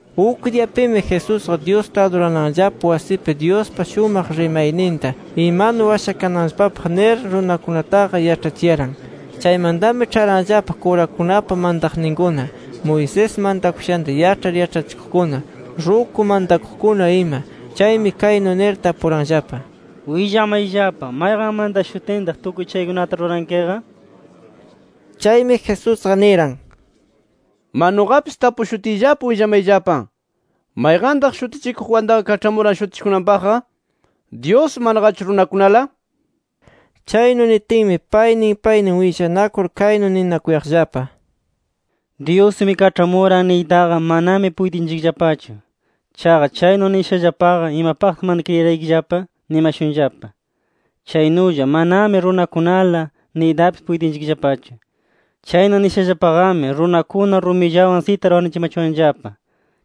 Uk diyapimi, Jesusqa Dyusta adurananllapa wasipi Dyuspa shumaq rimayninta imanu washakananllapapaq nir runakunataqa yaĉhachiyaran. Chaymantami, ĉharanllapa kurakunapa mantaqninkuna, Moisés mantakushanta yaĉhar yaĉhachikuqkuna, ruku mantakuqkuna ima. Chaymi kaynu nir tapuranllapa: —¡Willamayllapa! ¿Mayqan mantashutintaq tukuy chaykunata rurankiqa? Chaymi Jesusqa niran: —¡Ma nuqapis tapushutiyllapa, willamayllapa! ¿Mayqantaq Shutichikuq Juantaqa kaĉhamuran shutichikunanpaqqa? ¿Dyus, manaqachu runakunala? Chaynu nitinmi, paynin paynin willanakur kaynu ninakuyaqllapa: “ ‘Dyusmi kaĉhamuran’ niytaqa manami puytinchikllapachu. Chaqa, chaynu nishallapaqa ‘¿Imapaqtaq mana kriyiraykillapa?’ nimashunllapa. Chaynulla manami ‘Runakunala’ niytapis puytinchikllapachu. Chaynu nishallapaqami, runakuna rumillawan sitar wanuchimachuwanllapa.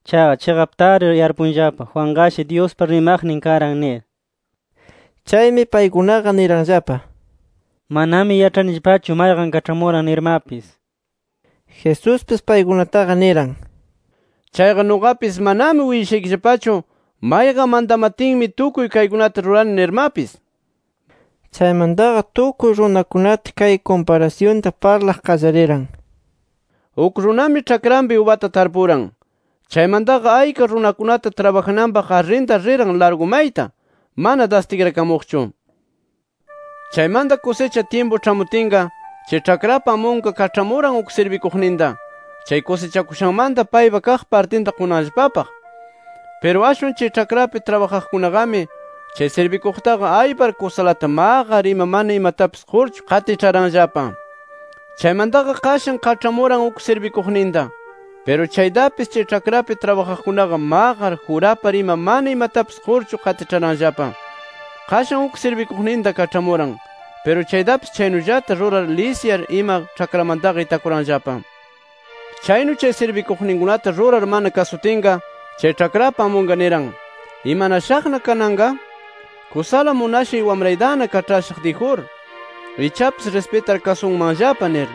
Chaqa chiqaptari yarpunllapa: Juanqa Dyuspa rimaqnin karan nir”. Chaymi paykunaqa niranllapa: —Manami yaĉhanillapachu mayqan kaĉhamuran nirmapis. Jesuspis paykunataqa niran: —Chayqa nuqapis manami willashaykillapachu, mayqan mantamatinmi tukuy kaykunata rurani nirmapis. Chaymantaqa tukuy runakunata kay kumparasyunta parlaq qallariran: “Uk runami ĉhakranpi ubata tarpuran. Chaymantaqa ayka runakunata trabajananpaq arrintar riran largu mayta, mana das tikrakamuqchu. Chaymanta kusicha tyimpu ĉhamutinqa, chay ĉhakrapa amunqa kaĉhamuran uk sirbikuqninta, chay kusichakushanmanta paypaq kaq partinta qunanllapapaq. Piru ashwan chay ĉhakrapi trabajaqkunaqami chay sirbikuqtaqa aypar kusalata maqar ima mana imatapis qurchu qatiĉharanllapa. “Chaymantaqa qashan kaĉhamuran uk sirbikuqninta. Piru chaytapis, chay ĉhakrapi trabajaqkunaqa maqar, jurapar ima mana imatapis qurchu qatiĉharanllapa. Qashan uk sirbikuqninta kaĉhamuran. Piru chaytapis chaynullata rurar lisyar ima ĉhakramantaqa itakuranllapa. “Chaynu chay sirbikuqninkunata rurar mana kasutinqa, chay ĉhakrapa amunqa niran: ‘¿Imanashaqna kananqa? Kusala munashay wamraytana kaĉhashaq dijur. Ichapis rispitar kasunmanllapa’ nir.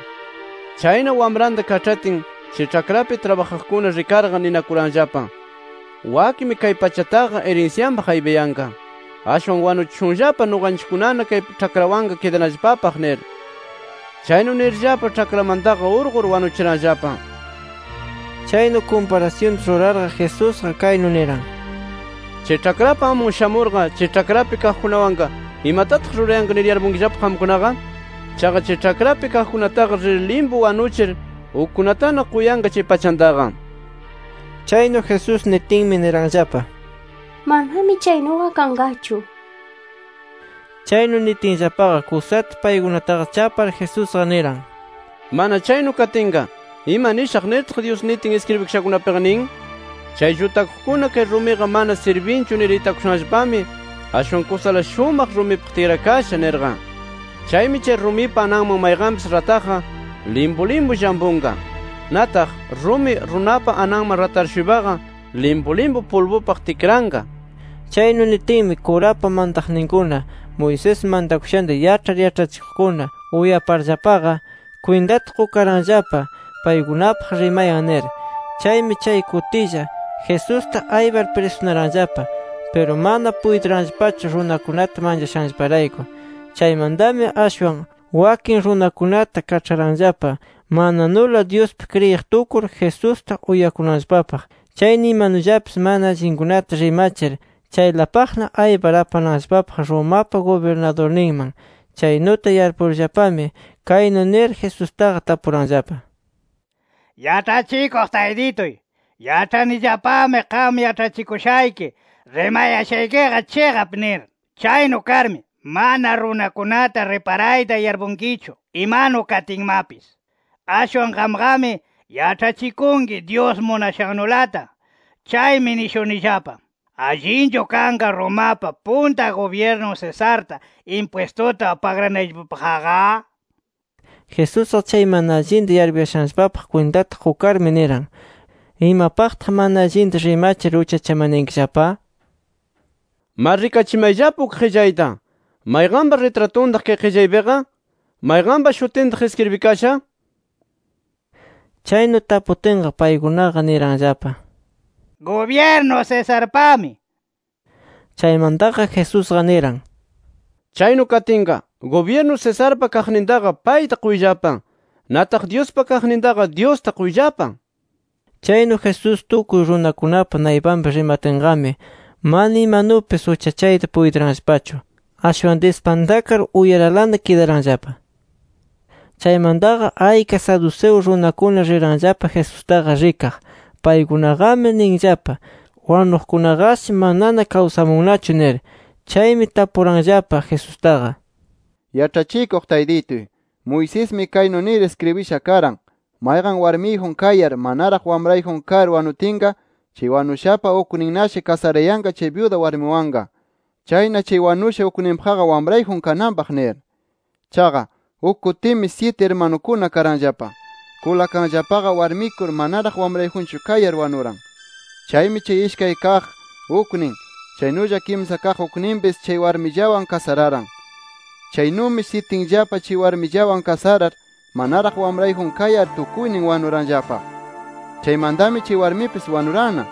“Chayna wamranta kaĉhatin, chay ĉhakrapi trabajaqkuna rikarqa, ninakuranllapa: ‘Wakmi kay pachataqa irinsyanpaq aypayanqa. ¡Ashwan wanuchishunllapa nuqanchikkunana kay ĉhakrawanqa kidanallapapaq!’ nir. Chaynu nirllapa ĉhakramantaqa urqur, wanuchiranllapa”. Chaynu kumparasyunta rurarqa Jesusqa kaynu niran: —Chay ĉhakrapa amun shamurqa, chay ĉhakrapi kaqkunawanqa, ¿imatataq rurayanqa nir yarpunkillapa qamkunaqa? Chaqa chay ĉhakrapi kaqkunataqa rir limpu wanuchir ukkunatana quyanqa chay pachantaqa. Chaynu Jesús nitinmi niranllapa: —¡Manami chaynuqa kanqachu! nir. Chaynu nitinllapaqa, kusata paykunataqa chapar Jesusqa niran: —Mana chaynu katinqa, ¿ima nishaq nirtaq, Dyus nitin iskribikashakunapiqa nin?: ‘Chay llutakuqkuna kay rumiqa mana sirbinchu nir itakushanllapami, ashwan kusala shumaq rumipaq tikrakasha’ nirqa. Chaymi, chay rumipa ananman mayqanpis rataqqa, limpu limpu llampunqa. Nataq, rumi runapa ananman ratar-shuypaqa, limpu limpu pulbupaq tikranqa nir. Chaynu nitinmi, kurapa mantaqninkuna, Moisés mantakushanta yaĉhar yaĉhachikuqkuna uyaparllapaqa, kwintata qukaranllapa paykunapaq rimayan nir. Chaymi chay kutilla, Jesusta aypar prisunaranllapa. Piru mana puytiranllapachu runakunata manchashanllaparayku. Chaymantami ashwan, wakin runakunata kaĉharanllapa mananula Dyuspi kriyiq tukur, Jesusta uyakunanllapapaq. Chayna imanullapis mana allinkunata rimachir, chaylapaqna aypar apananllapapaq Romapa gubirnadurninman. Chaynuta yarpurllapami, kaynu nir Jesustaqa tapuranllapa: —Yaĉhachikuq Taytituy, yaĉhanillapami qam yaĉhachikuyashayki, rimayashaykiqa chiqap nir. Chaynu karmi, mana runakunata riparayta yarpunkichu imanu katinmapis. Ashwan qamqami yaĉhachikunki Dyus munashannulata. Chaymi nishunillapa: ¿Allinchu kanqa Romapa punta gubyirnun Cesarta impwistuta pagranayllapapaqqa? Jesusqa chay mana allinta yarpuyashanllapapaq kwintata qukarmi, niran: —[¿Imapaqtaq mana allinta rimachir uchachamanayankillapa?] Ma, rikachimayllapa uk qillayta. ¿Mayqanpa ritratuntaq kay qillaypiqa? ¿Mayqanpa shutintaq iskribikasha? nir. Chaynu taputinqa, paykunaqa niranllapa: —Gubyirnu Cesarpami nir. Chaymantami Jesusqa niran: —Chaynu katinqa, gubyirnu Cesarpa kaqnintaqa payta quyllapa. Nataq Dyuspa kaqnintaqa Dyusta quyllapa. Chaynu Jesús tukuy runakunapa naypanpi rimatinqami, mana imanupis uchachayta puytiranllapachu. Ashwan dispantakar uyaralana kidaranllapa. Chaymantaqa ayka Saduceo runakuna riranllapa Jesustaqa rikaq. Paykunaqami ninllapa: “Wanuqkunaqashi manana kawsamunnachu” nir. Chaymi tapuranllapa Jesustaqa: —Yaĉhachikuq Taytituy, Moisesmi kaynu nir iskribisha karan: ‘Mayqan warmiyjun kayar, manaraq wamrayjun kar wanutinqa, chay wanushapa ukninnashi kasarayanqa chay byuda warmiwanqa. Chayna chay wanusha ukninpaqqa wamrayjun kananpaq’ nir. Chaqa, uk kutimi syiti irmanukuna karanllapa. Kulakanllapaqa, warmikur manaraq wamrayjunchu kayar wanuran. Chaymi chay ishkay kaq uknin, chaynulla kimsa kaq ukninpis chay warmillawan kasararan. Chaynumi syitinllapa chay warmillawan kasarar, manaraq wamrayjun kayar tukuynin wanuranllapa. Chaymantami chay warmipis wanuranna.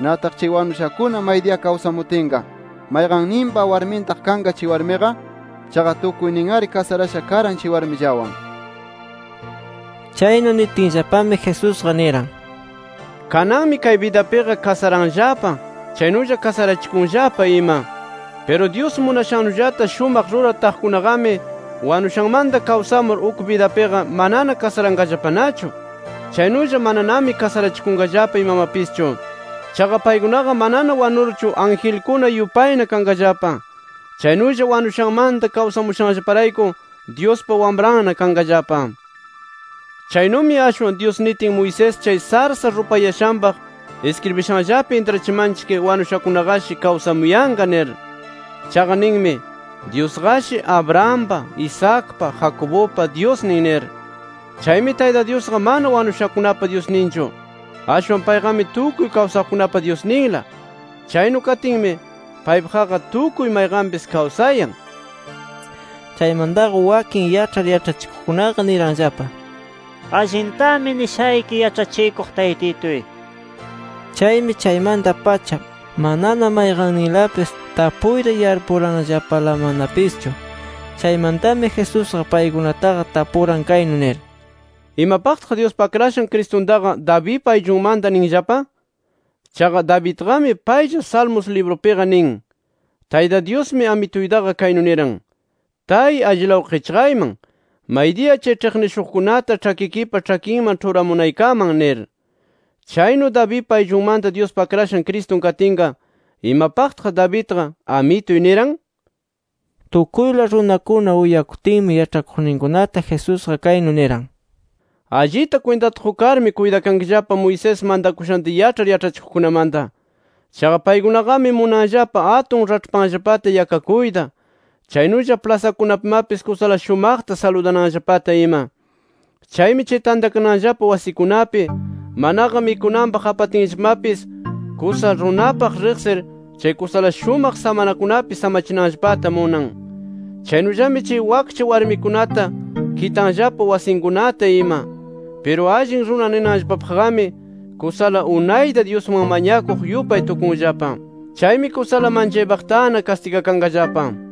Nataq chay wanushakuna maydiya kawsamutinqa ¿mayqanninpa warmintaq kanqa chay warmiqa? Chaqa tukuynin-ari kasarasha karan chay warmillawan. Chaynu nitinllapami, Jesusqa niran: —Kananmi kay bidapiqa kasaranllapa, chaynulla kasarachikunllapa ima. Piru, Dyus munashannullata shumaqta rurar taqkunaqami, wanushanmanta kawsamur uk bidapiqa, manana kasaranqallapanachu. Chaynulla mananami kasarachikunqallapa imamapischu. Chaqa paykunaqa manana wanurchu angelkuna yupayna kanqallapa. Chaynulla, wanushanmanta kawsamushanllaparayku, Dyuspa Wamranna kanqallapa. Chaynumi, ashwan Dyus nitin Moisés chay sarsa rupayashanpaq iskribishanllapi, intrachimanchik, wanushakunaqashi kawsamuyanqa nir. Chaqa ninmi: Dyusqashi, Abrahampa, Isaacpa, Jacobupa, Dyusnin nir. Chaymi, Tayta Dyusqa mana wanushakunapa Dyusninchu, ashwan payqami tukuy kawsaqkunapa Dyusninla. Chaynu katinmi, ¡paypaqqa tukuy mayqanpis kawsayan! nir. Chaymantaqa wakin yaĉhar yaĉhachikuqkunaqa niranllapa: —Allintami nishayki Yaĉhachikuq Taytituy. Chaymi chaymanta-pacha, manana mayqanninlapis tapuyta yarpuranllapalamanapischu. Chaymantami Jesusqa paykunataqa tapuran kaynu nir: —¿Imapaqtaq Dyuspa Akrashan Cristuntaqa Davidpa ayllunmanta ninllapa? Chaqa Davidqami paylla Salmos librunpiqa nin: ‘Tayta Dyusmi Amituytaqa kaynu niran: Tay allilaw qichqayman, maydiya chay ĉhiqnishuqkunata ĉhakikipa ĉhakinman ĉhuramunaykaman nir’. Chaynu Davidpa ayllunmanta Dyuspa Akrashan Cristun katinqa, ¿imapaqtaq Davidqa ‘Amituy’ niran? Tukuyla runakuna uyakutinmi yaĉhakuqninkunata Jesusqa kaynu niran: “Allita kwintata qukarmi, kuytakankillapa Moisés mantakushanta yaĉhar yaĉhachikuqkunamanta. Chaqa paykunaqami munanllapa atun raĉhpanllapata yakakuyta, chaynulla plasakunapimapis kusala shumaqta saludananllapata ima. Chaymi chay tantakananllapa wasikunapi manaqa mikunanpaq apatinllapamapis, kusa runapaq riqsir chay kusala shumaq samanakunapi samachinanllapata munan. Chaynullami chay wakcha warmikunata kitanllapa wasinkunata ima. Piru allin runa ninanllapapaqqami kusala unayta Dyusman mañakuq yupay tukunllapa. Chaymi kusala manchaypaqtana kastigakanqallapa” nir.